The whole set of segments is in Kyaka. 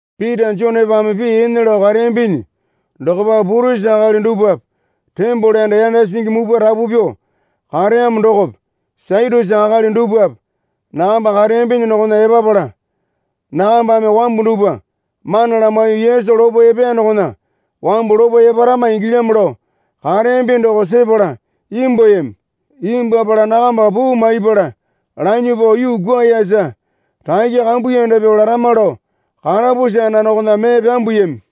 Pita Jonepame pii ene lao kareyambinyi dokopa purisi akali dupwape tembole anda yanda singi mupwa rapu pyuo kareyamo dokope Satyusi akali dupwape nakamba kareyambinyi dokona epapala, nakambame wambu dupwa mana lamaiyuo Yesu lopo epeya dokona wambu lopo eparama ingilyamo lao kareyambi doko sepala imbwuayami. Imbwuapala nakamba puu maiyapala lanyuo pao yuu kwuayasa rakya kambuyanda pyuo larama lao karapusi anda dokona mee pyambuyami.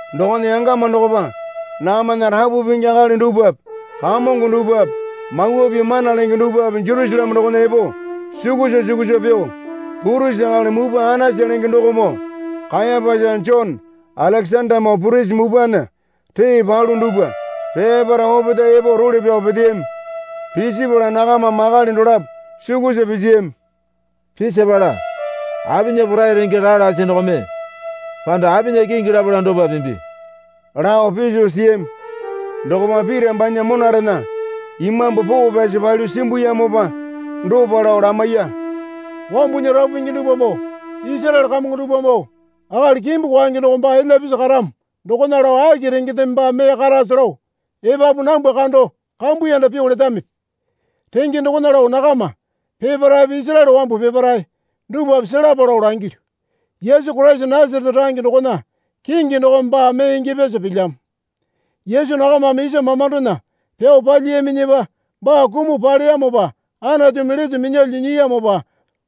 Dokona yangama dokopa nakamana rapu pingi akali dupwape kamongo dupwape, Mawa Pii mana lenge dupwape Jerusaleme dokona epo sukusa sukusa pyuo, Purisi akali mupwa Anasa lenge dokomoo Kayapasa Jone Alekesandamoo purisi mupwana ree palu dupwa peparae opetae epo role pyao peteyami. Pisipala nakamame akali dolapo sukusa pisiyami. Pisipala, Apinya porai renge raa lasi dokome panda apinya kingi lapala dopa pimbi? lao piso siyami. Dokopa Pita banya monarena Imambu Poo Pyasi palyuo simbuyamopa dopa lao lamaiya. Wambunya rapu pingi dupwamoo Isaraele kamongo dupwamoo, akali kimbu kwaenge doko baa elya pisi karamo dokona lao aki rengendeme baa mee karase lao epapu nambwa kando kambuyanda pyuo letamipi? Renge dokona lao nakama peparaepe Isaraele wambu peparae dupwape selapa lao langilyu. Yesu Koraisa Nasarete range dokona kingi dokome baa mee ingyapyasa pilyamo. Yesu nakamame isa mamandona pyao palyiyaminyipa baa kumuo paleyamopa Anatumi lete minyalyuo nyiyamopa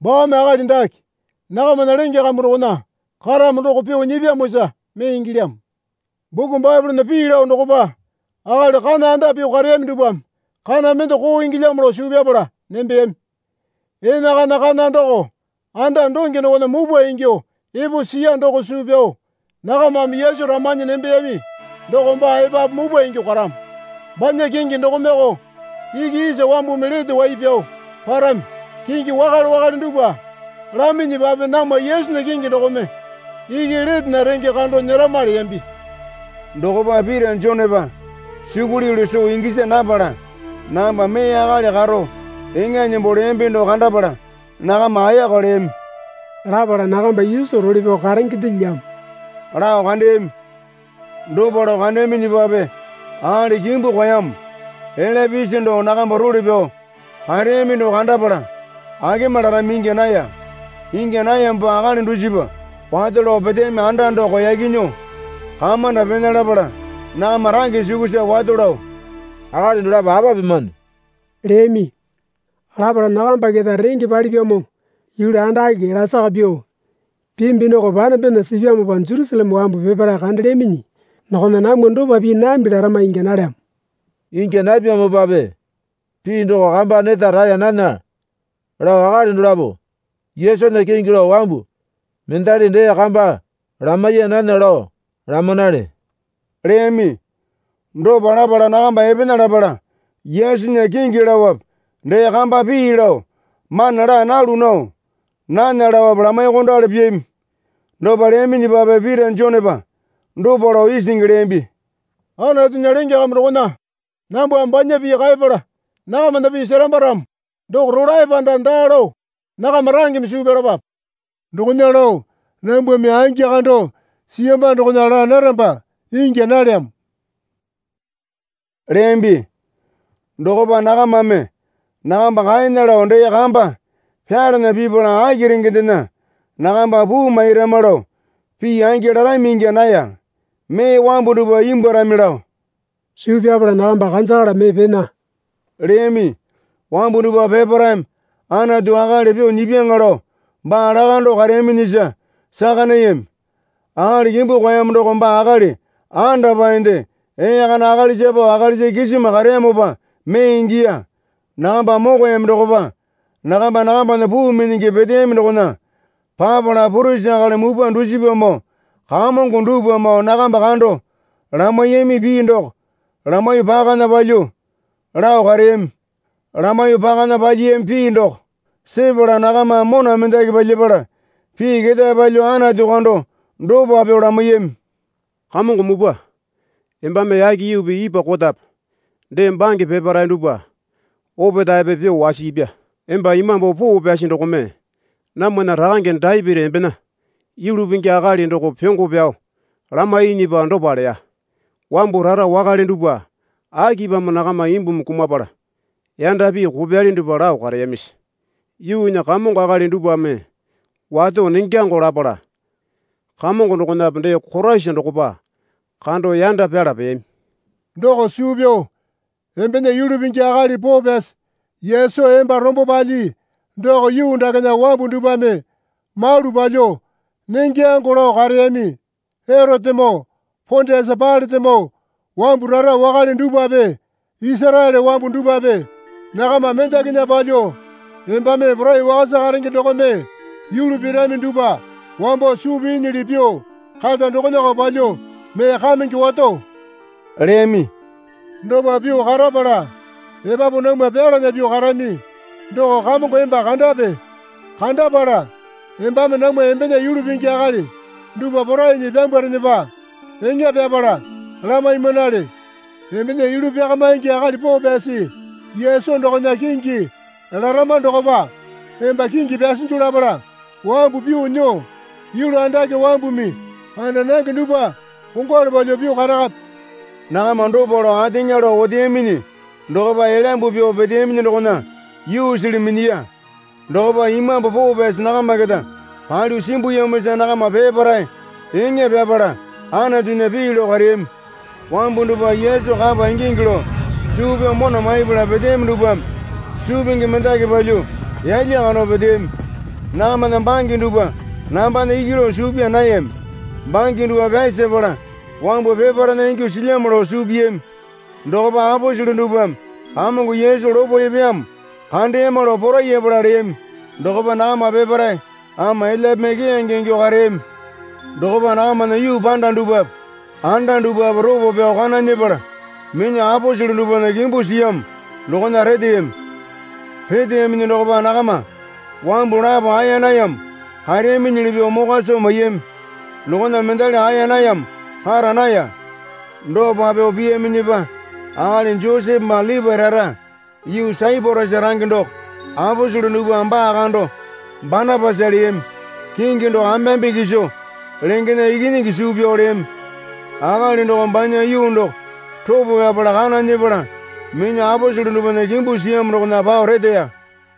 baame akali dake nakamana lenge kambu dokona karamo doko pyuo nyipyamosa mee ingilyamo. Buku Baepolena pii lao dokopa, Akali kana anda pyuo kareyami dupwame kana mende koo ingilyamo lao suu pyapala nembeyami. Enakana kana doko anda donge dokona mupwa ingyuo epo siya doko suu pyao nakamame Yesu ramanyi nembeyami doko baa epapu mupwa ingyuo karamo. Banya kingi dokomeoko iki isa wambumi lete wai pyao parami. Kingi wakale wakale dupwa laminyipape namwa Yesunya kingi dokome iki letena renge kando nyerama leyambi. Dokopa Pita Jonepa sukuli yulu soo gisa napala nakamba mee akali karo eŋa nembo leyambi doko kandapala nakama ayaka leyami. Lapala nakamba Yesu role pyao karengendelyamo lao kandeyami. Dopa lao kandeyaminyipape akali kimbu kwaeyamo elya pisi doko nakamba role pyao kareyami doko kandapala akema larami ingya naya. Ingya nayamopa akali dusipa wato lao peteyami anda doko yaki nyuo kamanda pena lapala nakama range sukusa wato lao, Akali dolapo apa pimane? leyami. Lapala, Nakamba keta renge palipyamo yulu andake lasaka pyuo pimbi doko panembena sipyamopa Jerusaleme wambu peparae kandelyaminyi dokona namwa dopa pii nambi larama ingya nalyamo. Ingya napyamopape pii doko kama neta raeya nana lao akali dolapo Yesunya kingi lao wambu mendali dee kamba lamaiya nana lao lamanale leyami. Dopa lapala nakamba epena lapala Yesunya kingi laope dee kamba pii lao mana laa nalu nao nana laope lamaiyuokondali piyami. Dopa leyaminyipape Pita Jonepa dopa lao isingi leyambi. Anatunya lenge kambu dokona nambwame banya pii kaepala nakamana pii seramba ramo doko rolae panda daa lao nakama rangeme suu pyalapape. Dokona lao nambwame angi kando siyamba dokona laa naramba ingya nalyamo leyambi. Dokopa nakamame nakamba kaena lao dee kamba pyalana pipala aki rengendena nakamba puu mairama lao pii angi larami ingya naya. Mee wambu dupwa imbwuarami lao suu pyapala nakamba kanjakala mee pena leyami. Wambu dupwa peparaeme Anatu akali pyuo nyipyaŋa lao baa lakando kareyaminyisa saka nayami. Akali kimbu kwaeyamo doko baa akali andapaende ee kana akalisa pao akalisa kisima kareyamopa mee ingiya. Nakamba mokoyami dokopa nakamba nakambana puu minyingi peteyami dokona papala purisi akali mupwa dusipamoo kamongo dupwamoo nakamba kando lamaiyami pii doko lamaiyuo pakana palyuo lao kareyami. Lamaiyuo pakana palyiyami pii doko sepala nakamame mona mendaki palyapala pii ketae palyuo Anatu kando dopa pyuo lamaiyami. Kamongo Mupwa, embame yake yuupi ipwa kotape dee bange peparae dupwa opetaepe pyuo wasiipya. Emba Imambu Poo Pyasi dokome namwana rakange Dapiti embena yulu pingi akali doko pyongo pyao lamainyipa dopa leya. Wambu rara wakale dupwa akipamo nakama imbumi kumapala yanda pii kopyali dupwa lao kareyamisi? Yuunya kamongo akali dupwame wato nengyango lapala Kamongo dokonape dee Koraisa dokopa kando yanda pyala peyami. Doko suu pyao embena Yulu Pingi akali poo pyasi Yesu emba rombo palyii doko yuu dakena wambu dupwame malu palyuo nengyango lao kareyami. Erotemoo Pondiasa Pailatemoo wambu rara wakale dupwape Isaraele wambu dupwape nakama mendakinya palyuo, embame porai wakasa karenge dokome yulu pirami dupwa wambo suu piinyili pyuo kata dokonako palyuo mee kamenge wato leyami. Dopa pyuo karapala epapu namwa pyalana pyuo karami doko Kamongo emba kandape. Kandapala embame namwa embena yulu pingi akali dupwa porainyi pyambwarenepa eŋa pyapala lamaimanale. Embena Yulu Pyakamaingi akali poo pyasi Yesu dokona kingi larama dokopa emba kingi pyasinju lapala wambu pyuo nyuo yulu andake wambumi kanda nange dupwa kongwalu palyuo pyuo karakape. Nakama dopa lao ateŋa lao oteyaminyi dokopa elyambu pyuo peteyaminyi dokona yuusili minyiya. Dokopa Imambu Poo Pyasi nakama keta palyuo simbuyamosa nakama peparae eŋa pyapala Anatunya pii lao kareyami. Wambu dupwa Yesu kapa ingingi lao suu pyao mona maipala peteyami dupwame suu pingi mendaki palyuo yalya kando peteyami. Nakamana bange dupwa nambana iki lao suu pyaa nayami. Bange dupwa pyasapala wambu peparaena ingyuo silyamo lao suu piyami. Dokopa aposele dupwame Kamongo Yesu lopo epeyamo kandeyama lao porayapala leyami. Dokopa nakama peparae ama elyape mee keyange ingyuo kareyami. Dokopa nakamana yuu panda dupwape anda dupwape ropo pyao kana nyepala minyuo aposele dupwana kimbu siyamo dokona reteyami. Reteyaminyi dokopa nakama wambu lapo aeya nayamo kareyaminyili pyuo mokwa soo maiyami. Dokona mendali aeya nayamo kara naya. Dopa pyuo piyaminyipa akali Josepe baa Lipae rara yuu Saiporasa range doko (aposele dupwame baa kando Banapasa leyami. Kingi doko ambeambe kiso lengena ikinyingi suu pyao leyami.) Akali dokome banya yuu doko ropo pyapala kana nyepala minyuo aposele dupwana kimbu siyamo dokona pao reteya.